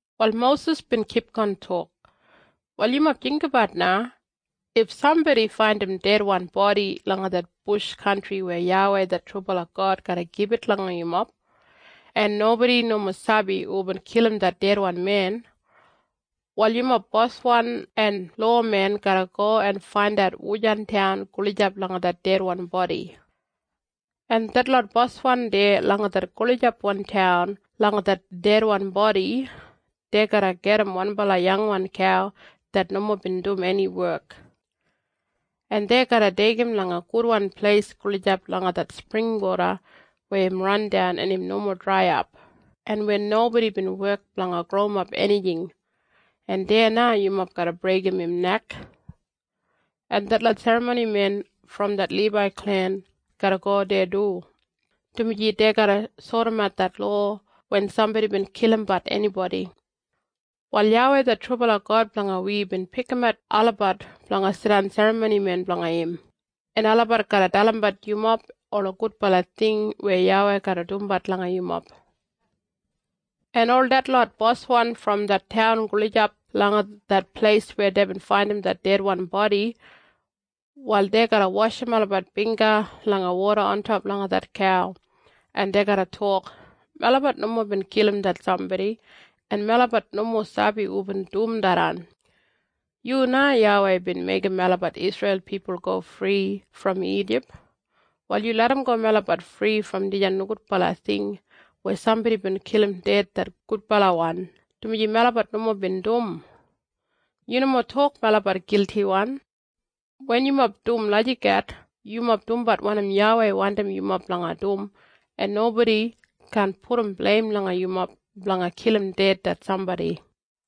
Wal Mosis bin kipgon tok, “Wal yumob jinggabat na. If sambodi faindim dedwan bodi langa det bush kantri weya YAWEI det trubala God garra gibit langa yumob, en nobodi nomo sabi hubin kilim det dedwan men, wal yumob boswan en lowamen garra go en faindat wujan taun gulijap langa det dedwan bodi. En detlot boswan deya langa det gulijapwan taun langa det dedwan bodi, dei garra gajim wanbala yangwan kau det nomo bin dum eni wek. En dei garra deigim langa gudwan pleis gulijap langa det springwoda weya im randan en im nomo draiyap, en weya nobodi bin wek blanga growimap enijing, en deya na yumob garra breigim im nek. En detlot serramonimen brom det Libai klen garra go deya du, dumaji dei garra sodimat det lowa wen sambodi bin kilimbat enibodi. Wal YAWEI det trubala God blanga wi bin pikimat olabat blanga jidan serramonimen blanga im, en olabat garra dalimbat yumob ola gudbala ting weya YAWEI garra dumbat langa yumob. En ol detlot boswan brom det taun gulijap langa det pleis weya deibin faindim det dedwan bodi, wal dei garra washim olabat bingga langa woda ontop langa det kau, en dei garra tok, ‘Melabat nomo bin kilim det sambodi, en melabat nomo sabi hubin dum tharran. Yu na YAWEI bin meigim melabat Isreil pipul go fri brom Ijip. Wal yu larramgo melabat fri brom dijan nogudbala ting weya sambodi bin kilim ded det gudbalawan, dumaji melabat nomo bin dum. Yu nomo tok melabat giltiwan.’ Wen yumob dum lagijat yumob dumbat wanim YAWEI wandim yumob blanga dum en nobodi kaan pudum bleim langa yumob blanga kilim ded det sambodi.”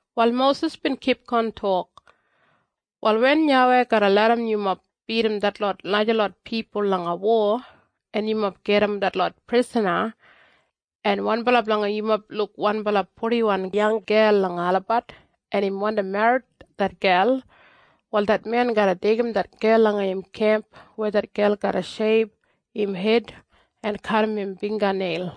Wal Mosis bin kipgon tok, “Wal wen YAWEI garra larram yumob bidim detlot najalot pipul langa wo, en yumob gajim detlot prisana, en wanbala blanga yumob luk wanbala purdiwan yanggel langa olabat, en im wandi merrit det gel, wal det men garra deigim det gel langa im kemp weya det gel garra sheib im hed en kadim im bingga neil,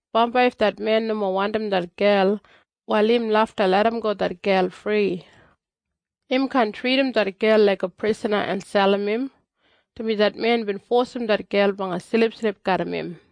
Bambai if det men nomo wandim det gel, wal im lafta larramgo det gel fri. Im kaan tridim det gel laiga prisana en selim im, dumaji det men bin fosim det gel blanga silipsilip garram im.”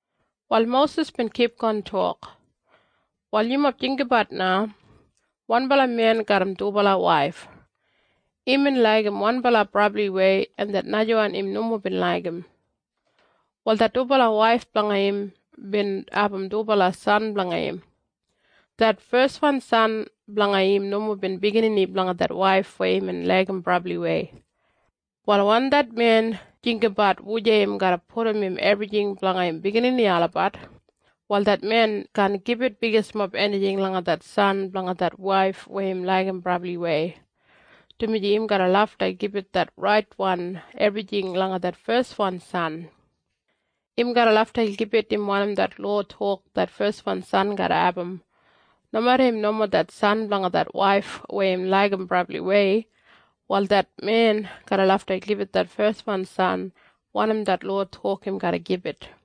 Wal Mosis bin kipgon tok, “Wal yumob jinggabat na. Wanbala men garram dubala waif. Imbin laigim wanbala brabliwei en det najawan im nomo bin laigim. Wal det dubala waif blanga im bin abum dubala san blanga im. Det feswan san blanga im nomo bin biginini blanga det waif weya imbin laigim brabliwei. Wal wen det men jinggabat wujei im garra pudum im ebrijing blanga im biginini olabat, wal det men kaan gibit bigismob enijing langa det san blanga det waif weya im laigim brabliwei, dumaji im garra lafta gibit det raitwan ebrijing langa det feswan san. Im garra lafta gibit im wanim det lowa tok det feswan san garra abum, nomeda im nomo det san blanga det waif weya im laigim brabliwei. Wal det men garra lafta gibit det feswan san wanim det lowa tok im garra gibit.”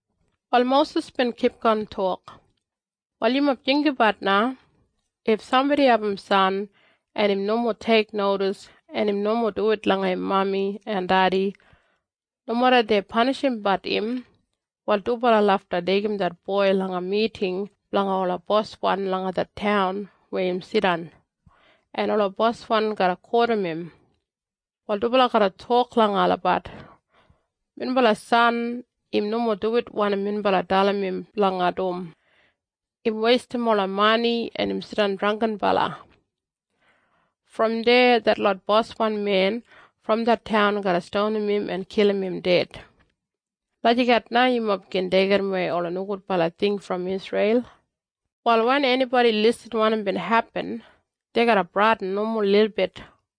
Wal Mosis bin kipgon tok, “Wal yumob jinggabat na. If sambodi abum san en im nomo teiknodis en im nomo duwit langa im mami en dedi, nomeda dei panishimbat im, wal dubala lafta deigim det boi langa miting blanga ola boswan langa det taun weya im jidan, en ola boswan garra kotim im. Wal dubala garra tok langa olabat, ‘Minbala san im nomo duwit wanim minbala dalim im blanga dum. Im weistim ola mani en im jidan drangginbala.’ Brom deya detlot boswan men brom det taun garra stonim im en kilim im ded. Lagijat na yumob gin deigimwei ola nogudwan ting brom Isreil. Wal wen enibodi irrim wanim bin hepin, dei garra bradin nomo lilbit.”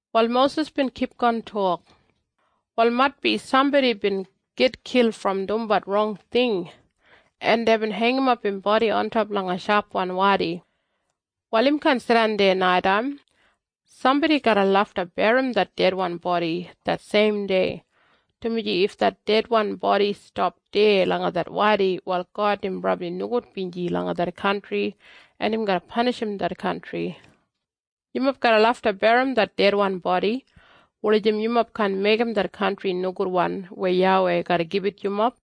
Wal Mosis bin kipgon tok, “Wal maitbi sambodi bin gitkil brom dumbat rong ting, en deibin heingimap im bodi ontop langa shapwan wadi. Wal im kaan jidan deya naitaim. Sambodi garra lafta berrim det dedwan bodi det seim dei, dumaji if det dedwan bodi stap deya langa det wadi wal God im brabli nogudbinji langa det kantri en im garra panishim det kantri. Yumob garra lafta berrim det dedwan bodi wulijim yumob kaan meigim det kantri nogudwan weya YAWEI garra gibit yumob.”